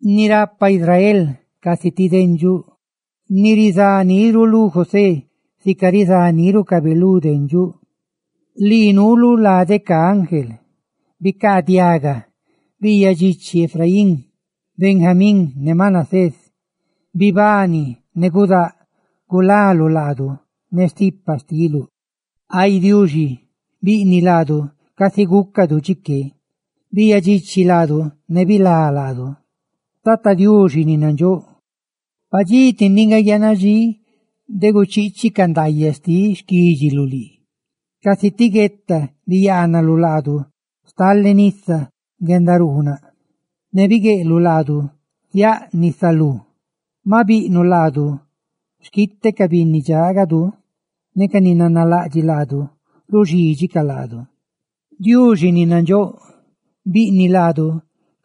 Ni rapa Israel casi ti dendxuꞌ, ni rizá niru lú José sica rizá nírucabe lu dendxuꞌ, lii nuuluꞌ lade ca ángel, ¡bicaadiaga! ¡Biiyaꞌ dxichi Efraín, Benjamín ne Manasés! ¡Bibani ne gudáꞌ gulaluꞌ laadu ne stipa xtiluꞌ! Ay Diuxi, ¡biꞌniꞌ laadu casi gúcadu chiqué! ¡Biiyaꞌ dxichi laadu ne bilá laadu! Tata Diuxi ni nandxóꞌ, padxí ti ndiꞌ nga guiaana dxí de guchiichiꞌ ca diidxaꞌ ndaayaꞌ xtiꞌ xquídxiluꞌ lii. Casi ti gueta biyaanaluꞌ laadu stale nisa guendaruunaꞌ; ne bigueꞌluꞌ laadu ziáꞌ nisa biete ludu. Ma biꞌnuꞌ laadu xquite ca binni dxaagadu, ne ca ni nanalaꞌdxiꞌ laadu ruxídxicaꞌ laadu. Diuxi ni nandxóꞌ, ¡biꞌniꞌ laadu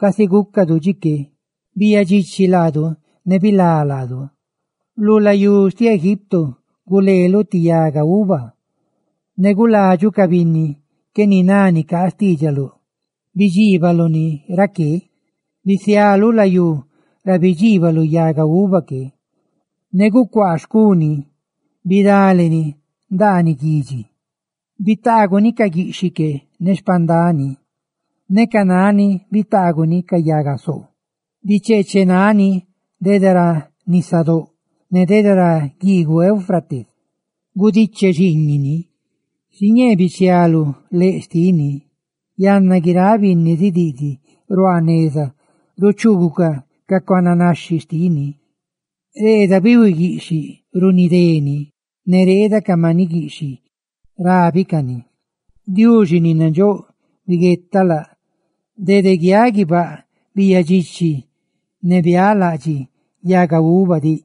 casi gúcadu chiqué! ¡Biiyaꞌ dxichi laadu ne bilá laadu! Lu layú xtiꞌ Egipto guleeluꞌ ti yaga uva; ne guladxuꞌ ca binni qué niná nicaa xtiidxaluꞌ, ne bidxiibaluꞌ ni raqué. Bisialuꞌ layú ra bidxiibaluꞌ yaga uva que, ne gucuaa xcu ni bidaleni ndaaniꞌ guidxi. Bitaaguni ca guiꞌxhiꞌ que ne xpandani, ne ca nani bitaaguni ca yaga soo. Bicheechenani dede ra nisadóꞌ, ne dede ra guiiguꞌ Éufrates gudiche xiiñiꞌ ni. Xiñee bichialuꞌ leꞌ xtini, yanna guiráꞌ binni zidiꞌdiꞌ ruaa neza ruchuugucaꞌ ca cuananaxhi xtini. Reeda bihui guiꞌxhiꞌ runidé ni; ¡ne reeda ca maniꞌ guiꞌxhiꞌ rábicani! Diuxi ni nandxóꞌ, biguetaꞌ, biguetaꞌ laꞌ; dede guiaꞌ guibáꞌ biiyaꞌ dxichi, ne bialaꞌdxiꞌ yaga uva diꞌ,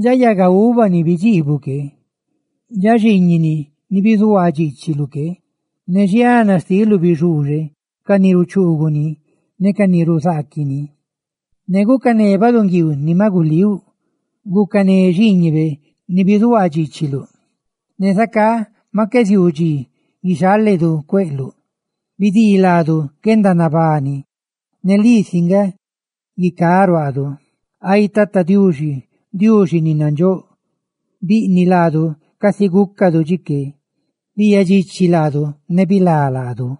dxa yaga uva ni bidxiibuꞌ que, dxa xiiñini ni bizuhuaa dxiichiluꞌ que. Ne xiana xtiluꞌ bixuuxe ca ni ruchuuguꞌ ne ruzaaquiꞌ ni; ne gucané baꞌdunguiiu ni maꞌ gulíuꞌ, gucané xiiñibe ni bizuhuaa dxiichiluꞌ, ne zacá maꞌ qué ziuu dxi guixaledu cueꞌluꞌ. ¡Bidii laadu guendanabani, ne lii si nga guicá ruaadu! Ay Tata Diuxi, Diuxi ni nandxóꞌ, ¡biꞌniꞌ laadu casi gúcadu chiqué! ¡Biiyaꞌ dxichi laadu ne bilá laadu!